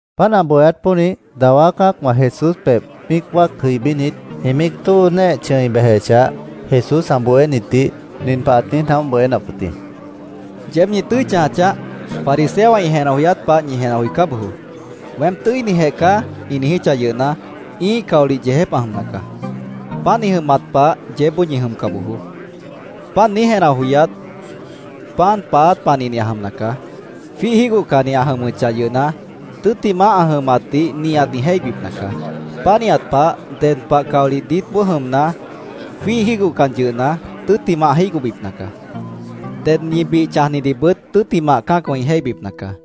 Páant ã bohéát pónih dawá cã́acwã Jesús pebh míic wáac jʉibínit, ĩ míic tóo néeh chʉ̃i bejechah, Jesús ã bohénitdih nin pah ãt niíj naóh bohénap wʉt jĩ: “¡Yeéb ñi tʉ́i chãja chaáh! Fariseowã ĩ jenah joyát pah ñi jenah joicá bojoó. ‘Weém tʉ́inijeh caá’, ĩ niijíchah yʉhna, ĩ́ih caolih yeejép ã jʉmna caá. Páant ĩ jʉmat pah yeébboó ñi jʉmca bojoó. Páant niíj jenah joyát, pan paáát panihni ã jʉmna caá. Jwíih jígohcanni ã jʉmʉchah yʉhna, tʉ́ttimah ã jʉmatdih nihat ĩ jéihbipna caá. Pánihat pah, ded pah caolih diítboó jʉmna, jwíih jígohcan yʉhna, tʉ́ttimah ã jígohbipna caá. Ded ñi bih chãjnidihbʉt tʉ́ttimah cã́acwã ĩ jéihbipna caá.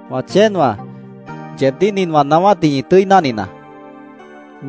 “Wã chéenwãá, yeebdíh nin wã naáwátdih ñi tʉ́i náhninaá: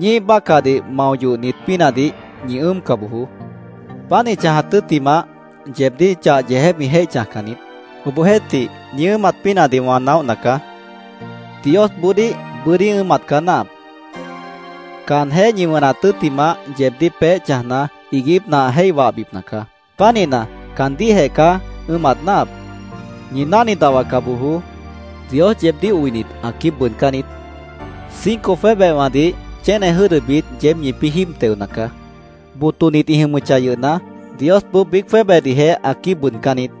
Ñíih bácahdih mao yohnit pínahdih ñi ʉ́ʉmca bojoó. Páant ĩ chãjat tʉ́ttimah, yeebdíh chah yeejép ĩ jéih chãjcan niít. Obohjeéhtih, ñi ʉ́ʉmat pínahdih wã naóhna caá. ¡Diosboodíh bʉ́dí ʉ́ʉmat caá náahap! Caanjéh ñi wʉnat tʉ́ttimah, yeebdíh peéh chãjna, iiguípna ã jéih wahbipna caá. Pánihna, caandíhjeh caá ʉ́ʉmat náahap. “Ñi náhni dahwaca bojoó. Dios yeebdíh oinit, ã quíib bʉʉdcán niít. Cinco jwébehwãdih chéne jʉ́dʉbit yeéb ñipĩ́ jíib teona caá. Botonit ĩ jʉmʉchah yʉhna, Diosboó biíc jwébehdihjeh ã quíib bʉʉdcán niít.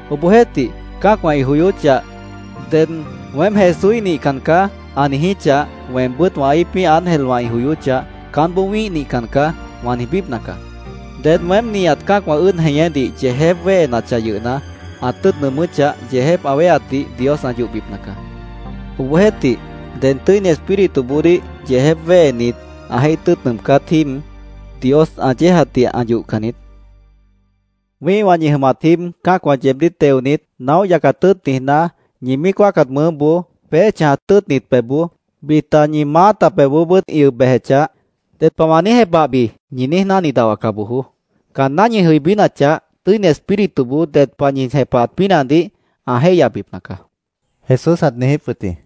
Obohjeéhtih, cã́acwã ĩ joyóchah, ded ‘Weém Jesúíh nihcan caá’, ã niijíchah, weembʉ́t wã íipíh ángelwã ĩ joyóchah, ‘Caánboó wĩ́ih nihcan caá’, wã niijbípna caá. Ded weém nihat cã́acwã ʉ́ʉd jeñédih yeejép wéhenachah yʉhna, ã tʉ́ʉt nʉʉmʉ́chah, yeejép ã wéheatdih Dios ã yohbipna caá. Obohjeéhtih, ded Tʉ́ini Espírituboodíh yeejép wéhenit, ã jéih tʉ́ʉt nʉʉmcát jíib, Dios ã yéejatdih ã yohcan niít. “Wĩ́ihwã ñi jʉmat jíib cã́acwã yeebdíh teonit, naóh yacat tʉ́ʉt niijná, ñi míic wáacat mʉʉ́boó, peéh chãjat tʉ́ʉtnit pebhboó, bita ñi maáta pebhboobʉ́t ĩ ʉb bejechah, ‘¿Ded pah wã niíj jepahbi?’ ñi niíj náhni dahwaca bojoó. Caanná ñi jʉibínachah, Tʉ́ini Espírituboó ded pah ñi jepahat pínahdih ã jéihyabipna caá”, Jesús ãt niijíp wʉt jĩ.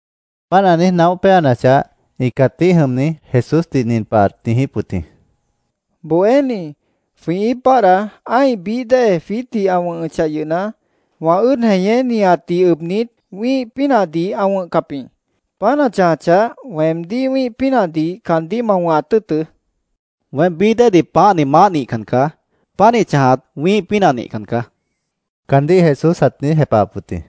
Páant ã niíj naóh péanachah, ĩ cãtíh jʉmni Jesúsdih nin pah ãt niijíp wʉt jĩ: —Bohéní, jwĩ íip báadhda ã́ih bií dée jwiítdih ã wʉ̃hʉchah yʉhna, wã ʉ́ʉd jeñé nihatdih ʉbnit, wĩ́ih pínahdih ã wʉ̃hcap jĩ. Páant ã chãjachah, weemdíh wĩ́ih pínahdih caandíh ma wʉ̃hat tʉ́ʉtʉ́, ãt niijíp wʉt yʉh jĩ. —Weém bií déedih pãáhni maáh nihcan caá. Pánih chãjat wĩ́ih pínah nihcan caá, caandíh Jesús ãt niíj jepahap wʉt jĩ.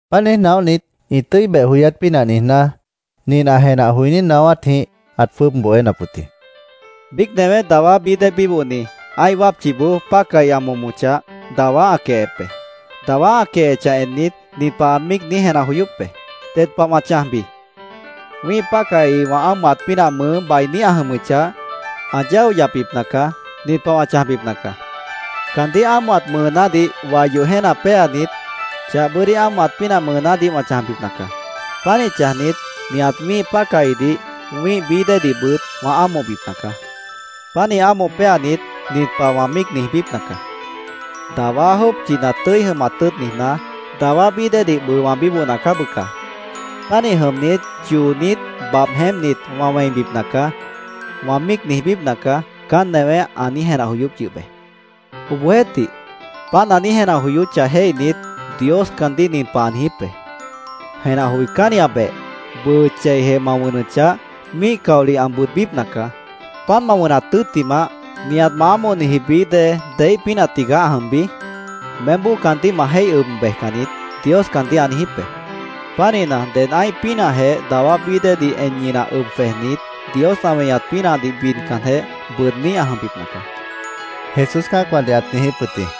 Páant niíj naóhnit, ĩ tʉ́i beh joyát pínah niijná, nin ã jenah joiní naáwátjĩh ãt jwʉ́ʉb bohénap wʉt jĩ: “Biíc newé dawá bií dée bíbohni, ã́ih wápchiboó pácahi ã momochah, dawá ã quehep be. Dawá ã quehechah ennit, nin pah ã míic niíj jenah joyóp be: ‘¿Ded pah wã chãjbi? Wĩ́ih pácahi wã ámohat pínah mʉʉ́ bainí ã jʉmʉchah, ã yáo yapbipna caá. Nin pah wã chãjbipna caá: Caandíh ámohat mʉʉnádih wai yoh jéena péanit, chah bʉ́dí ámohat pínah mʉʉnádih wã chãjbipna caá. Pánih chãjnit, nihat wĩ́ih pácahidih, wĩ́ih bií déedihbʉt wã ámohbipna caá. Pánih ámoh péanit, nin pah wã míic niijbípna caá: “Dawá jópchina tʉ́i jʉmat tʉ́ʉt niijná, dawá bií déedih bʉʉ wã bíbohna caá, bʉca. Pánih jʉmnit, choonít, babh jeémpnit, wã wẽibipna caá”, wã míic niijbípna caá’, caán newé ã niíj jenah joyóp yʉh be. Obohjeéhtih, páant ã niíj jenah joyóchah jéihnit, Dios caandíh nin pah ã niijíp be: ‘¡Jenah joicánniabeh! Bʉʉ cheijeh ma wʉnʉchah, míih caolih ã bʉʉdbípna caá. ¿Páant ma wʉnat tʉ́ttimah, nihat ma ámohniji bií dée deíh pínah tigaá ã jʉmbi? Meémboó caandíh ma jéih ʉb bejcan niít’, Dios caandíh ã niijíp be. Pánihna, ded ã́ih pínahjeh dawá bií déedih en ñinah ʉb jwejnit, Dios ã weñat pínahdih bidcanjeh, bʉʉdní ã jʉmbipna caá”, Jesús cã́acwãdih ãt niijíp wʉt jĩ.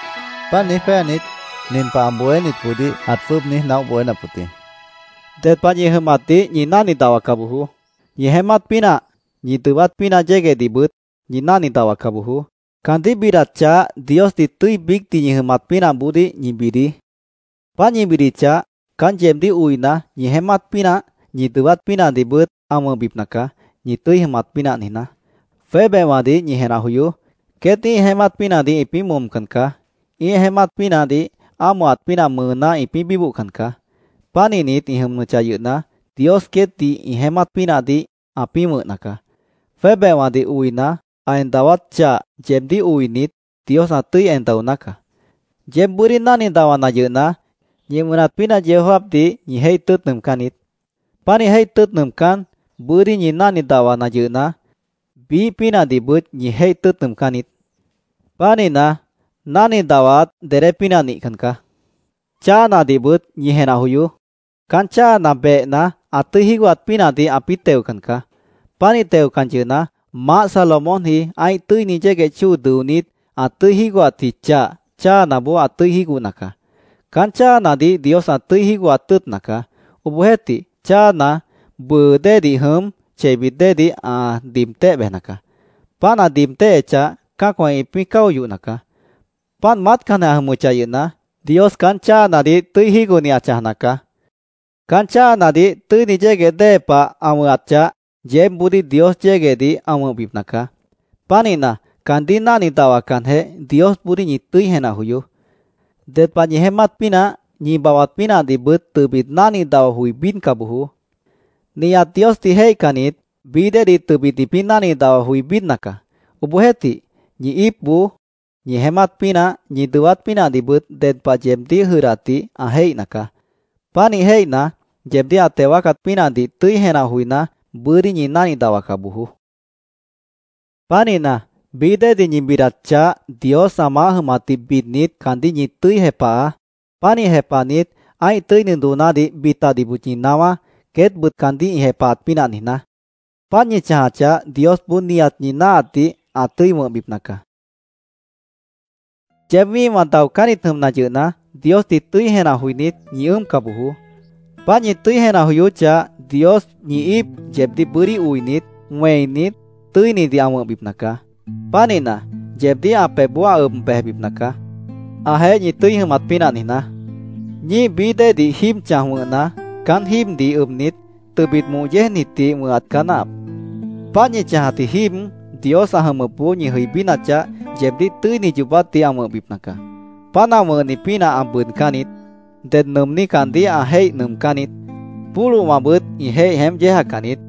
Páant niíj péanit, nin pah ã bohénitboodíh ãt jwʉ́ʉb niíj naóh bohénap wʉt jĩ: “Ded pah ñi jʉmatdih ñi náhni dahwaca bojoó. Ñi jeémát pínah, ñi dʉwát pínah yéguehdihbʉt, ñi náhni dahwaca bojoó. Caandíh bidat chah Diosdih tʉ́i biícdih ñi jʉmat pínahboodíh ñi bidií. Páant ñi bidichah, caán yeebdíh oina, ñi jeémát pínah, ñi dʉwát pínahdihbʉt ã wʉ̃hbipna caá, ñi tʉ́i jʉmat pínah niijná. Jwébehwãdih ñi jenah joyoó. Queét ĩ́ih jeémát pínahdih ĩpĩ́ momcan caá. Ĩ́ih jeémátdih ámohat pínah mʉʉná ĩpĩ́ bíbohcan caá. Pánihnit ĩ jʉmʉchah yʉhna, Dios queétdih ĩ jeémát pínahdih ãpĩ́ wʉ̃hna caá. Jwébehwãdih oina, ã en dawát chah, yeebdíh oinit, Dios ã tʉ́i en daoná caá. Yeéb bʉ́dí náhni dahwana yʉhna, ñi wʉnat pínah yeó jáapdih ñi jéih tʉ́ʉt nʉʉmcán niít. Pánih jéih tʉ́ʉt nʉʉmcán, bʉ́dí ñi náhni dahwana yʉhna, biíh pínahdihbʉt ñi jéih tʉ́ʉt nʉʉmcán niít. Pánihna, náhni dahwaat dedé pínah nihcan caá. Cháanadihbʉt ñi jenah joyoó. Caán cháana behna, ã tʉ́i jígohat pínahdih ãpĩ́ teocan caá. Pánih teocan yʉhna, Maáh Salomónji ã́ih tʉ́ini yégueh chóo dʉonít, ã tʉ́i jígohatji chah, cháanaboó ã tʉ́i jígohna caá. Caán cháanadih Dios ã tʉ́i jígohat tʉ́ʉtna caá. Obohjeéhtih, cháana bʉʉ déedih jʉm, cheibit déedih ã diib téh bejna caá. Páant ã diib téhechah, cã́acwã ĩpĩ́ cáo yohna caá. Páant maátcanjeh ã jʉmʉchah yʉhna, Dios caán cháanadih tʉ́i jígohni ã chãjna caá. Caán cháanadih tʉ́ini yégueh dée pah ã wʉ̃hat chah, yeébboodíh Dios yéguehdih ã wʉ̃hbipna caá. Pánihna, caandíh náhni dahwacanjeh, Diosboodíh ñi tʉ́i jenah joyoó. Ded pah ñi jeémát pínah, ñi babhbat pínahdihbʉt tʉbit náhni dahwa joi bídca bojoó. Nihat Diosdih jéihcannit bií déedih tʉbit ĩpĩ́ náhni dahwa joi bídna caá. Obohjeéhtih, ñi íipboó ñi jeémát pínah, ñi dʉwát pínahdihbʉt ded pah yeebdíh jʉdhdatdih ã jéihna caá. Pánih jéihna, yeebdíh ã teo wáacat pínahdih tʉ́i jenah joiná, bʉ́dí ñi náhni dahwaca bojoó. Pánihna, bií déedih ñi bidat chah, Dios ã maáh jʉmatdih bidnit, caandíh ñi tʉ́i jepahaá. Pánih jepahnit, ã́ih tʉ́ini doonádih bitadihbʉt ñi naáwá, queétbʉt caandíh ĩ jepahat pínah niijná. Páant ñi chãjachah, Diosboó nihat ñi náahatdih ã tʉ́i wʉ̃hbipna caá”, Jesús ãt niijíp wʉt jĩ. “Yeéb wĩ́ihwã daocánnit jʉmna yʉhna, Diosdih tʉ́i jenah joinít, ñi ʉ́ʉmca bojoó. Páant ñi tʉ́i jenah joyóchah, Dios ñi íip yeebdíh bʉ́dí oinit, wẽinit, tʉ́inidih ã wʉ̃hbipna caá. Pánihna, yeebdíh ã pebhboó ã ʉb bejbipna caá, ãjeéh ñi tʉ́i jʉmat pínah niijná. Ñíih bií déedih jíib chãj wʉ̃hna, caán jíibdih ʉbnit, tʉbit moh yéejnitdih wʉ̃hat caá náahap. Páant ñi chãjatji jíib, Dios ã jʉmʉpboó ñi jʉibínachah, yeebdíh tʉ́ini yoobátdih ã wʉ̃hbipna caá. Páant ã wʉ̃hni pínah ã bʉʉdcán niít. Ded nʉʉmní caandíh ã jéih nʉʉmcán niít. Pólohwãbʉt ĩ jéih jeémp yéejacan niít.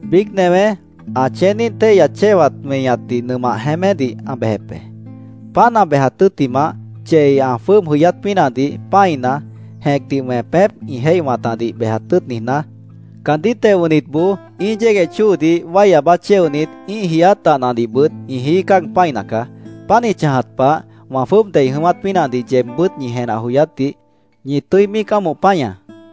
Biíc newé ã chéeníh téihya chéwat weñatdih nʉmah jeémédih ã bejep be. Páant ã bejat tʉ́ttimah, chei ã jwʉ́ʉb jʉyát pínahdih pã́ina, jẽcdih wẽpép ĩ jéih wãtadih bejat tʉ́ʉt niijná, caandíh teo wʉ̃hnitboó ĩ́ih yégueh chóodih wái aabá chéonit, ĩ́ih jiiát dahnadihbʉt ĩ jií cáag pã́ina caá. Páant ĩ chãjat pah, wã jwʉ́ʉb dei jʉ̃ʉ́wát pínahdih yeebbʉ́t ñi jenah joyátdih ñi tʉ́i míic ámoh páñaá.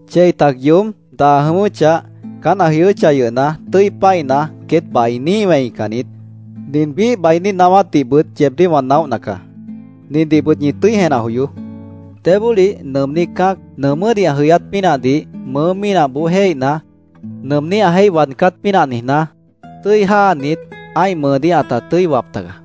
Chei tac yoób, daa jʉ̃ʉ́wʉ́chah, caán ã jʉyʉ́chah yʉhna, tʉ́i pã́ina, queét bainí ĩ wẽican niít. Nin biíh bainí naáwátdihbʉt yeebdíh wã naóhna caá: Nindihbʉt ñi tʉ́i jenah joyoó. Débólih nʉʉmní cã́ac nʉʉmʉ́dih ã jʉyát pínahdih mʉʉ́ mínahboó jéihna, nʉʉmní ã jéih waadcát pínah niijná, tʉ́i jáanit, ã́ih mʉʉdíh ãta tʉ́i wap tagaá.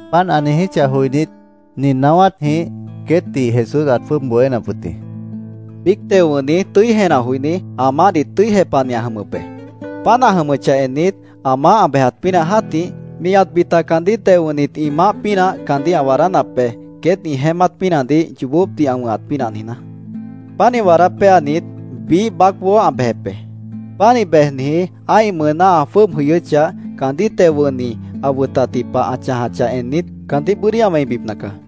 Páant ã niijíchah joinít, nin naáwátjĩh queétdih Jesús ãt jwʉ́ʉb bohénap wʉt jĩ: “Biíc teo wʉ̃hni tʉ́i jenah joiní, ã maáhdih tʉ́i jepahni ã jʉmʉp be. Páant ã jʉmʉchah ennit, ã maáh ã bejat pínah jã́tih, nihat bita caandíh teo wʉ̃hnit ĩ maáh pínah caandíh ã waadánap be, queét ĩ jeémát pínahdih yoobópdih ã wʉ̃hat pínah niijná. Pánih waadá péanit, biíh baácboó ã bejep be. Pánih bejniji ã́ih mʉʉná ã jwʉ́ʉb jʉyʉ́chah, caandíh teo wʉ̃hni ã wʉtatji pah ã chãjachah ennit, caandíh bʉ́dí ã wẽibipna caá.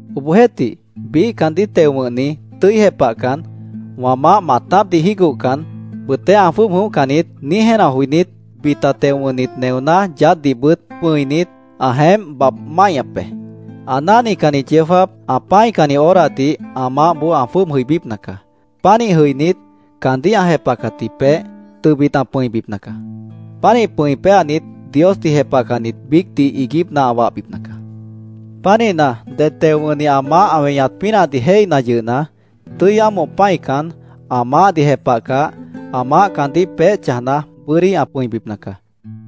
Obohjeéhtih, biíh caandíh teo wʉ̃hni tʉ́i jepahcan, ‘Wã maáh maatápdih jígohcan, bʉʉtéh ã jwʉ́ʉb jʉ̃óhcan niít’, niíj jenah joinít, bita teo wʉ̃hnit neoná yaádhdihbʉt pʉ̃init, ã jeémp babh máihñap be. Ã náhnicanni yeó jáap, ã pã́icanni horadih ã maáhboó ã jwʉ́ʉb jʉibípna caá. Pánih jʉinít, caandíh ã jepahcatji peéh, tʉbit ã pʉ̃ibipna caá. Pánih pʉ̃i péanit, Diosdih jepahcannit biícdih iiguípna ã wahbipna caá. Pánihna, ded teo wʉ̃hni ã maáh ã weñat pínahdih jéihna yʉhna, tʉ́i ámoh pã́ican, ã maáhdih jepahcah, ã maáh caandíh peéh chãjna, bʉ́dí ã pʉ̃ibipna caá.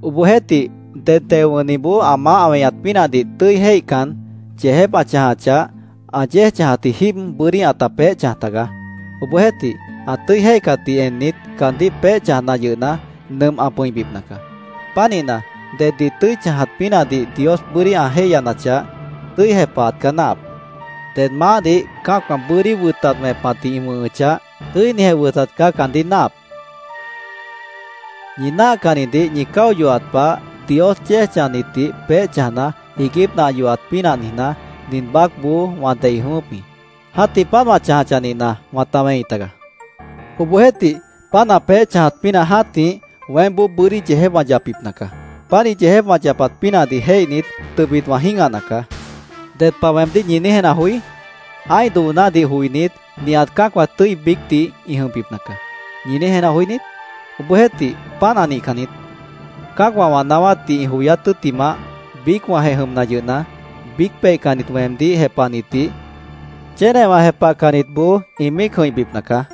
Obohjeéhtih, ded teo wʉ̃hniboó ã maáh ã weñat pínahdih tʉ́i jéihcan, yeejép ã chãjachah, ã yéej chãjat jíib bʉ́dí ãta peéh chãj tagaá. Obohjeéhtih, ã tʉ́i jéihcatdih ennit, caandíh peéh chãjna yʉhna, nʉmp ã pʉ̃ibipna caá. Pánihna, deddih tʉ́i chãjat pínahdih Dios bʉ́dí ã jéihyanachah, tʉ́i jepahat caá náahap. Ded maáhdih cã́acwã bʉ́dí wʉtat wẽpatdih ĩ wʉ̃hʉchah, tʉ́inijeh wʉtat caá caandíh náahap”, Jesús ãt niijíp wʉt jĩ. “Ñi náahcannidih ñi cáo yohat pah, Dios yéej chãjnitdih peéh chãjna, iiguípna ã yohat pínah niijná, nin baácboó wã dei jʉ̃ʉ́wʉ́p jĩ. ¡Jã́tih páant ã chãjachah nihna, wãta wẽi tagaá! Obohjeéhtih, páant ã peéh chãjat pínah jã́tih, weémboó bʉ́dí yeejép wã yapbipna caá. Pánih yeejép wã yapat pínahdih jéihnit, tʉbit wã jĩ́gahna caá. ¿Ded pah weemdíh ñi niíj jenah joí? ‘Ã́ih doonádih joinít, nihat cã́acwã tʉ́i biícdih ĩ jʉmbipna caá’, ¿ñi niíj jenah joí niít? Obohjeéhtih, páant ã nihcan niít. Cã́acwã wã naáwátdih ĩ joyát tʉ́ttimah, biícwãjeh jʉmna yʉhna, biíc peihcannit weemdíh jepahnitdih chénewã jepahcannitboó ĩ míic jʉ̃ihbipna caá.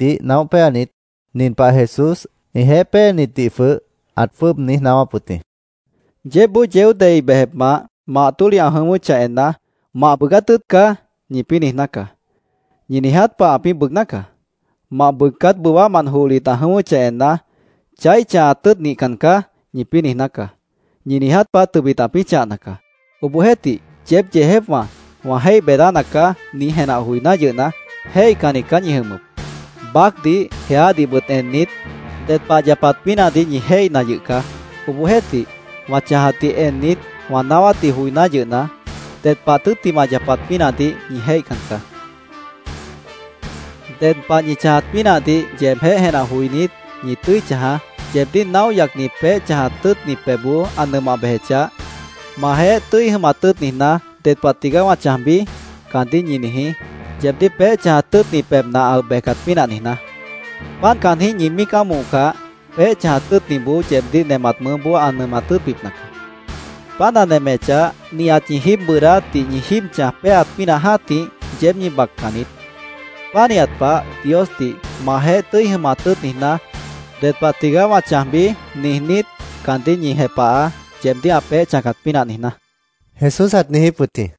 Páant ã bohénitdih naóh péanit, nin pah Jesús ĩjeéh péenitdih jwʉh ãt jwʉ́ʉb niíj naáwáp wʉt jĩ: “Yeébboó yeó dei bejepmant mah tólihna ã jʉ̃ʉ́wʉ́chah enna, ‘Mah bʉʉgát tʉ́ʉt caá’, ñipĩ́ niijná caá. Ñi niiját pah ãpĩ́ bʉʉgná caá. Mah bʉʉgcáp bʉwámant johlit ã jʉ̃ʉ́wʉ́chah enna, ‘Chaíh chãhat tʉ́ʉt nihcan caá’, ñipĩ́ niijná caá. Ñi niiját pah tʉbit ãpĩ́ chãhna caá. Obohjeéhtih, yeéb yeejépwã, ‘Wã jéih beedána caá’, niíj jenah joiná yʉhna, jéihcannit caá ñi jʉmʉp. Baácdih, jeádihbʉt ennit, ded pah ã yapat pínahdih ñi jéihna yʉh caá. Obohjeéhtih, wã chãjatdih ennit, wã naáwátdih joiná yʉhna, ded pah tʉ́ttimah ã yapat pínahdih ñi jéihcan caá”, Jesús queét cã́acwãdih ãt niijíp wʉt jĩ. “Ded pah ñi chãjat pínahdih yeebjéh jenah joinít, ñi tʉ́i chãjaá. Yeebdíh naóh yacni peéh chãjat tʉ́ʉtni pebhboó ã nʉmah bejechah, ‘¿Majeéh tʉ́i jʉmat tʉ́ʉt niijná, ded pah tigaá wã chãjbi?’ caandíh ñi niijí, yeebdíh peéh chãjat tʉ́ʉtni pebhna ã ʉb bejcat pínah niijná. Páant caanjĩ́h ñi míic ámohcah, peéh chãjat tʉ́ʉtniboó yeebdíh nemat mʉʉ́boó ã nemat tʉ́ʉtbipna caá. Páant ã nemechah, nihat ñi jíib bʉʉdáátdih ñi jíib chãj péaat pínah jã́tih, yeéb ñi baccan niít. Pánihat pah, Diosdih ‘¿Majeéh tʉ́i jʉmat tʉ́ʉt niijná, ded pah tigaá wã chãjbi?’ niijnít, caandíh ñi jepahaá, yeebdíh ã peéh chãjcat pínah niijná”, Jesús ãt niijíp wʉt jĩ.